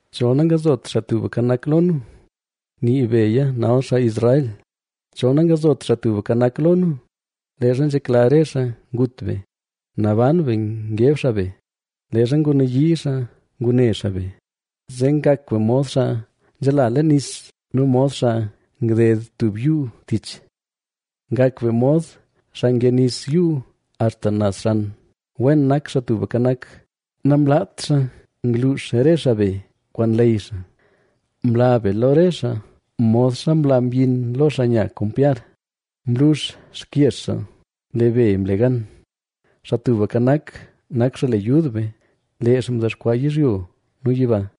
Chol nangzot Xaa Tubka Nak lo nu, nii beya nal xaa Israel, chol nangzot Xaa Tubka Nak lo nu, leezha nzhekla re xaa ngut be, naban be ngeb xaa be, leezha ngunayii xaa ngune xaa be, zee ngak be mod xaa nzhala leen nis nu mod xaa ngded tub yuu tich. Ngak be mod xaa nge nis yuu axta naz xan. ¡Wen nak Xaa Tubka Nak, namlaat xaa ngluux re xaa be kwaan leyy xaa! Mla be lo re xaa modxa nla myin lo xaa nya kompyar; mlux xkyex xaa, ¡lee be mle gan! ¡Xaa Tubka Nak, nak xaa le yud be, lee xaa mdexkwaa yizhyo nu yiba!